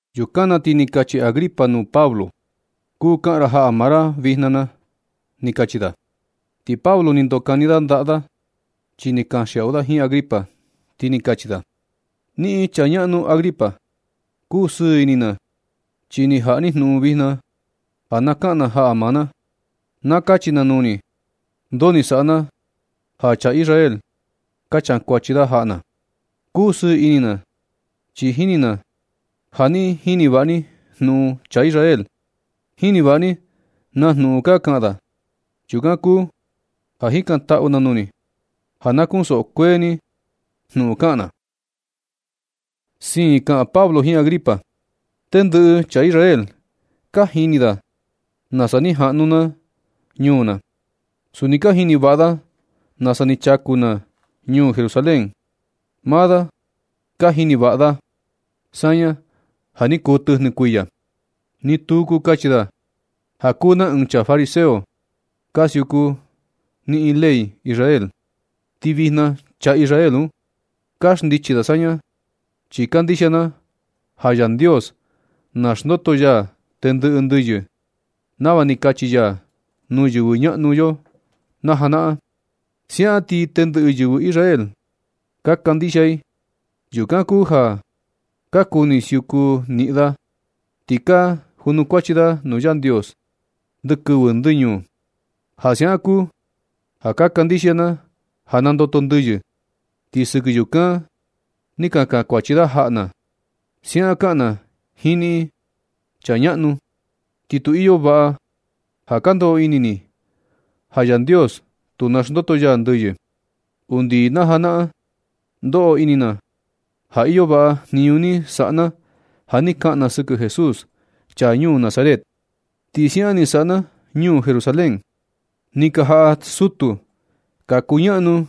Yukan na ti ni kachi Agripa nuu Pablo: ―Kuu kaꞌan ra jaꞌa maa ra vijna na ―ni kachi da. Ti Pablo ni ndokani da ndaꞌa da, chi ni kanxiaꞌu da jiin Agripa, ti ni kachi da: ―Niꞌin, chaa ñaꞌnu Agripa, kusɨɨ ini na, chi ni jaꞌa ni jnuꞌun vijna ja na kaꞌan na jaꞌa maa na. Na kachi na nuu ni ndoo ni saꞌa na ja chaa Israel ka kankuachi da jaꞌa na. Kusɨɨ ini na, chi jini na ja niꞌin jini vaꞌa ni jnuꞌun chaa Israel. Jini vaꞌa ni na jnuꞌun ka kaꞌan da. Yukan kuu ja jikantaꞌu na nuu ni ja na kunsoꞌo kuee ni jnuꞌun kaꞌan na. Siin kaꞌan Pablo jiin Agripa: ―Tendɨꞌɨ chaa Israel ka jini da nasa ni jaꞌnu na ñuu na. Suni ka jini vaꞌa da nasa ni chaku na ñuu Jerusalén. Maa da ka jini vaꞌa da saña ja ni kuu tɨjnɨ kuiya. Ti nu kuu kachi da ja kuu na ɨɨn chaa fariseo ka siuku niꞌin taka ley Israel. Ti vijna chaa Israel un, ka xndichi da saña chi kandixia na ja Yandios naxndoto ya tendɨꞌɨ ndɨyɨ nava ni kachi ya nuu yɨvɨ ñaꞌnu yo najanaꞌan. Siaꞌan ti tendɨꞌɨ yɨvɨ Israel ka kandixia i. Yukan kuu ja ka kuni siuku niꞌin da, ti ka junukuachi da nuu Yandios ndɨ kɨvɨ ndɨ ñuu. Ja siaꞌan kuu ja kandixia na ja nandoto ndɨyɨ, ti sɨkɨ yukan ni ka kankuachi da jaꞌa na. Siaꞌan kaꞌan na jiin niꞌin, chaa ñaꞌnu. Ti tu iyo vaꞌa ja ka ndoꞌo ini ni ja Yandios tu naxndoto ya ndɨyɨ. Undi najanaꞌan, ndoꞌo ini na ja iyo vaꞌa jniñu ni saꞌa na ja ni kaꞌan na sɨkɨ Jesús, chaa ñuu Nazaret. Ti siaꞌan ni saꞌa na ñuu Jerusalén. Ni ka jaꞌa sutu ka kuñaꞌnu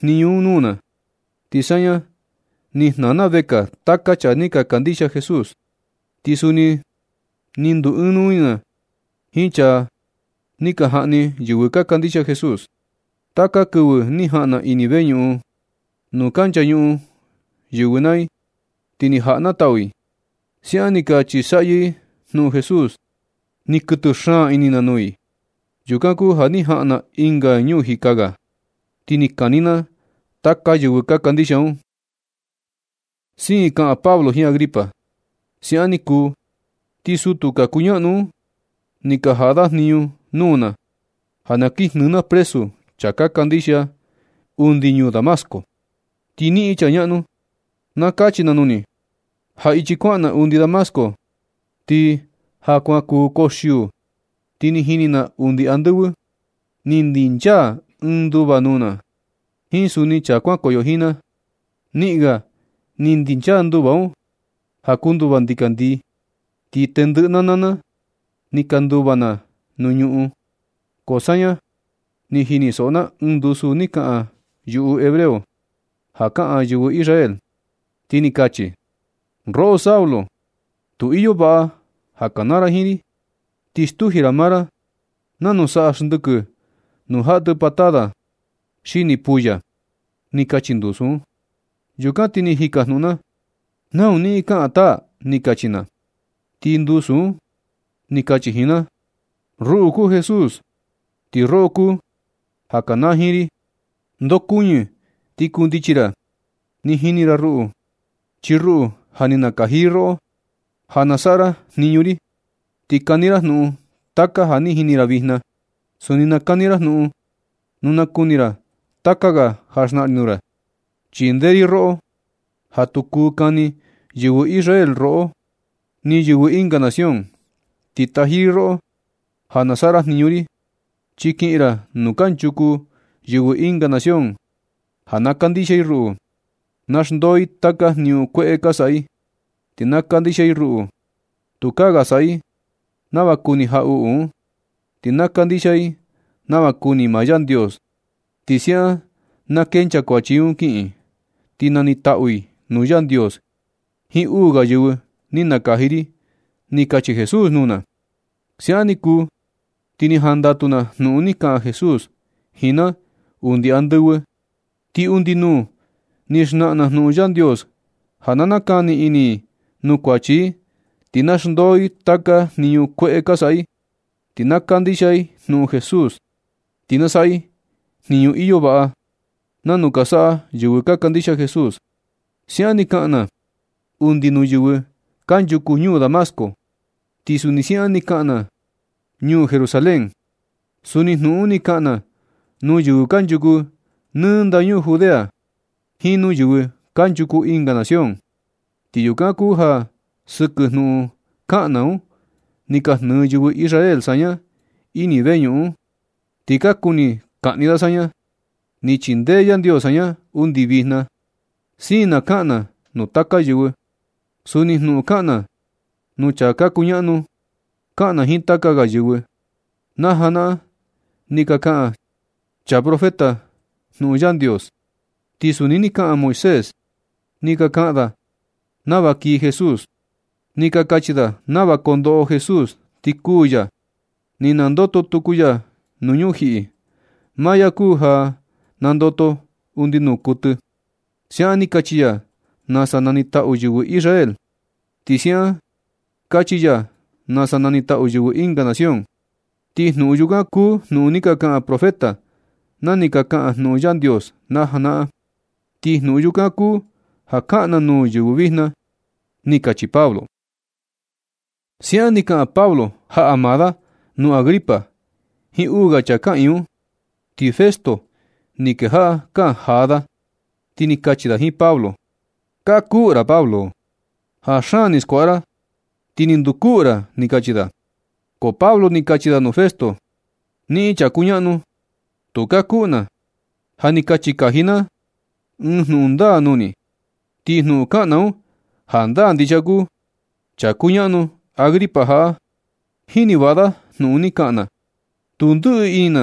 jniñu un nuu na, ti saña ni jnaa na vekaa taka chaa ni ka kandixia Jesús. Ti suni nɨ ndu ɨɨn nuu ini na jiin chaa ni ka jaꞌni yɨvɨ ka kandixia Jesús. Taka kɨvɨ ni jaꞌan na ini veñuꞌun nuu ka nchañuꞌun yɨvɨ naa i, ti ni jaꞌa na tau i. Siaꞌan ni ka chisaꞌyɨ i jnuꞌun Jesús. Ni kuɨtɨ xaan ini na nuu i. Yukan kuu ja ni jaꞌan na ɨnga ñuu jika ga, ti ni kani na taka yɨvɨ ka kandixia un. Siin kaꞌan Pablo jiin Agripa: ―Siaꞌan ni kuu, ti sutu ka kuñaꞌnu un, ni ka jaꞌa da jniñu nuu na ja na kin jnɨɨ na presu chaa ka kandixia undi ñuu Damasco. Ti niꞌin, chaa ñaꞌnu, na kachi na nuu ni ja ichi kuaꞌan na undi Damasco, ti ja kuan kuu koxiuu, ti ni jini na undi andɨvɨ ni ndinchaa ɨɨn nduva nuu na, jiin suni chaa kuankoyo jiin na, niꞌin ga ni ndinchaa nduva un ja kuu nduva ndikandii. Ti tendɨꞌɨ na naa na ni ka nduva na nuu ñuꞌun, ko saña ni jinisoꞌo na ɨɨn ndusu ni kaꞌan yuꞌu hebreo (ja kaꞌan yɨvɨ Israel), ti ni kachi: “Roꞌo Saulo, tu iyo vaꞌa ja ka kanaa ra jiin ri. Ti stuji ra maa ra, nanu saꞌa xndɨkɨ nu jaꞌa tɨ patada punta puya”, ni kachi ndusu un. Yukan ti ni jikajnuꞌun na: “Nau niꞌin kaꞌan taa”, ni kachi na. Ti ndusu un ni kachi jiin na: “Ruꞌu kuu Jesús, ti roꞌo kuu ja kanaa jiin ri. Ndokuɨñɨ ti kundichi ra. Ni jini ra ruꞌu, chi ruꞌu ja ni nakaji ri roꞌo ja na saꞌa ra jniñu ri, ti kani ra jnuꞌun taka ja ni jini ra vijna. Suni nakani ra jnuꞌun nu na kuni ra taka ga ja xnaꞌan ri nuu ra. Chindee ri roꞌo ja tu kuu kani yɨvɨ Israel roꞌo, ni yɨvɨ ɨnga nación. Ti taji ri roꞌo ja na saꞌa ra jniñu ri, chi kiꞌin ra nuu kanchuku yɨvɨ ɨnga nación, ja na kandixia i ruꞌu. Na xndoo i taka jniñu kueꞌe ka saꞌa i, ti na kandixia i ruꞌu. Tukaa ga saꞌa i nava kuni jaꞌuꞌu un, ti na kandixia i nava kuni maa Yandios. Ti siaꞌan na kenchaa kuachi i un kiꞌin, ti nanitaꞌu i nuu Yandios jiin uu ga yɨvɨ ni nakaji ri”, ni kachi Jesús nuu na. Siaꞌan ni kuu, ti ni jandatu na jnuꞌun ni kaꞌan Jesús jiin na undi andɨvɨ. Ti undi nuu, ni xnaꞌan na jnuꞌun Yandios ja na nakani ini i nuu kuachi i, ti na xndoo i taka jniñu kueꞌe ka saꞌa i, ti na kandixia i jnuꞌun Jesús. Ti na saꞌa i jniñu iyo vaꞌa, nanu ka saꞌa yɨvɨ ka kandixia Jesús. Siaꞌan ni kaꞌan na undi nuu yɨvɨ kanchuku ñuu Damasco, ti suni siaꞌan ni kaꞌan na ñuu Jerusalén. Suni jnuꞌun un ni kaꞌan na nuu yɨvɨ kanchuku nɨ ndañuu Judea jiin nuu yɨvɨ kanchuku ɨnga nación. Ti yukan kuu ja sɨkɨ jnuꞌun kaꞌan na un, ni ka jnɨɨ yɨvɨ Israel saña ini veñuꞌun un, ti ka kuni kaꞌni da saña. Ni chindee Yandios saña undi vijna. Siin na kaꞌan na nuu taka yɨvɨ. Suni jnuꞌun kaꞌan na nuu chaa ka kuñaꞌnu, kaꞌan na jiin taka ga yɨvɨ. Na janaꞌan ni ka kaꞌan chaa profeta jnuꞌun Yandios, ti suni ni kaꞌan Moisés. Ni ka kaꞌan da nava kii Jesús. Ni ka kachi da nava kondoꞌo Jesús ti kuū ya, ti nandoto tuku ya nuu ñujiꞌi. Maa ya kuu ja nandoto undi nuu kuɨtɨ. Siaꞌan ni kachi ya nasa nanitaꞌu yɨvɨ Israel. Ti siaꞌan kachi ya nasa nanitaꞌu yɨvɨ ɨnga nación. Ti jnuꞌun yukan kuu jnuꞌun ni ka kaꞌan profeta na ni ka kaꞌan jnuꞌun Yandios najanaꞌan. Ti jnuꞌun yukan kuu ja kaꞌan na nuu yɨvɨ vijna ―ni kachi Pablo. Siaꞌan ni kaꞌan Pablo jaꞌa maa da nuu Agripa jiin uu ga chaa kaꞌiin un. Ti Festo ni kejaꞌa kaꞌan jaa da, ti ni kachi da jiin Pablo: ―Kakuꞌu ra, Pablo. Ja xaan ni skuaꞌa ra, ti ni ndukuꞌu ra ―ni kachi da. Ko Pablo ni kachi da nuu Festo: ―Niꞌin chaa kuñaꞌnu, tu kakuꞌu na. Ja ni kachi kaji na ɨɨn jnuꞌun ndaa nuu ni, ti jnuꞌun kaꞌan na un, jandaa ndixia kuu. Chaa kuñaꞌnu Agripa jaꞌa, jini vaꞌa da jnuꞌun ni kaꞌan na. Tu ndɨꞌɨ ini na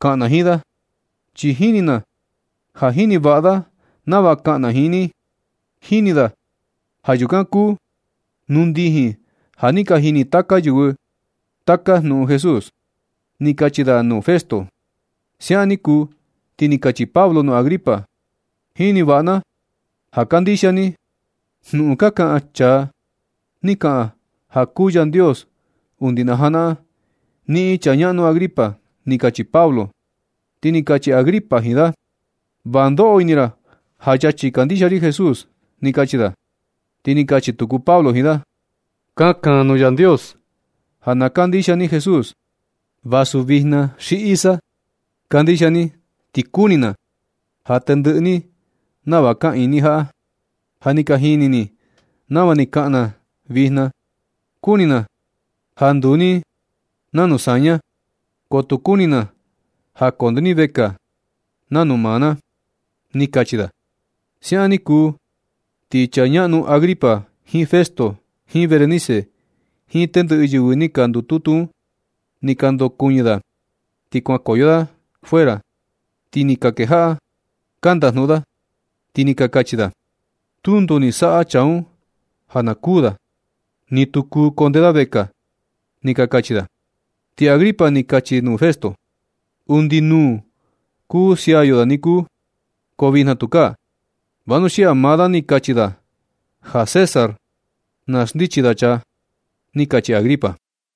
kaꞌan na jiin da, chi jini na ja jini vaꞌa da nava kaꞌan na jiin ni. Jini da ja yukan kuu nuu ndijin ja ni ka jini taka yɨvɨ taka jnuhun Jesús ―ni kachi da nuu Festo. Siaꞌan ni kuu ti ni kachi Pablo nuu Agripa: ―Jini vaꞌa na ja kandixia ni jnuꞌun ka kaꞌan chaa ni ka kaꞌan ja kuu Yandios undi na ja naꞌan, niꞌin, chaa ñaꞌnu Agripa ―ni kachi Pablo. Ti ni kachi Agripa jiin da: ―Va ndoꞌo ini ra ja yachi kandixia ri Jesús ―ni kachi da. Ti ni kachi tuku Pablo jiin da: ―Kakan nuu Yandios ja na nakandixia ni Jesús. Vasu vijna xi luego ni, kandixia ni ti kuni na ja tendɨꞌɨ ni nava ka iin jaꞌa. Ja ni ka jini ni nava ni kaꞌan na vijna. Kuni na ja nduu ni cuenta saña ko tu kuni na ja konde ni vekaa cuenta maa na ―ni kachi da. Siaꞌan ni kuu ti chaa ñaꞌnu Agripa jiin Festo jiin Berenice jiin tendɨꞌɨ yɨvɨ ni ka ndututu un ni ka ndokuɨñɨ da. Ti kuankoyo da fuera ti ni ka kejaꞌa ka ndajnuꞌun da, ti ni ka kachi da: ―Tu ndoo ni saꞌa chaa un ja na kuu da, ni tu kuu konde da vekaa ―ni ka kachi da. Ti Agripa ni kachi nuu Festo: ―Undi nuu kuu sia yo da ni kuu, ko vijna tu kaa, vanuxia ja maa da ni kachi da ja César na xndichi da chaa ―ni kachi Agripa.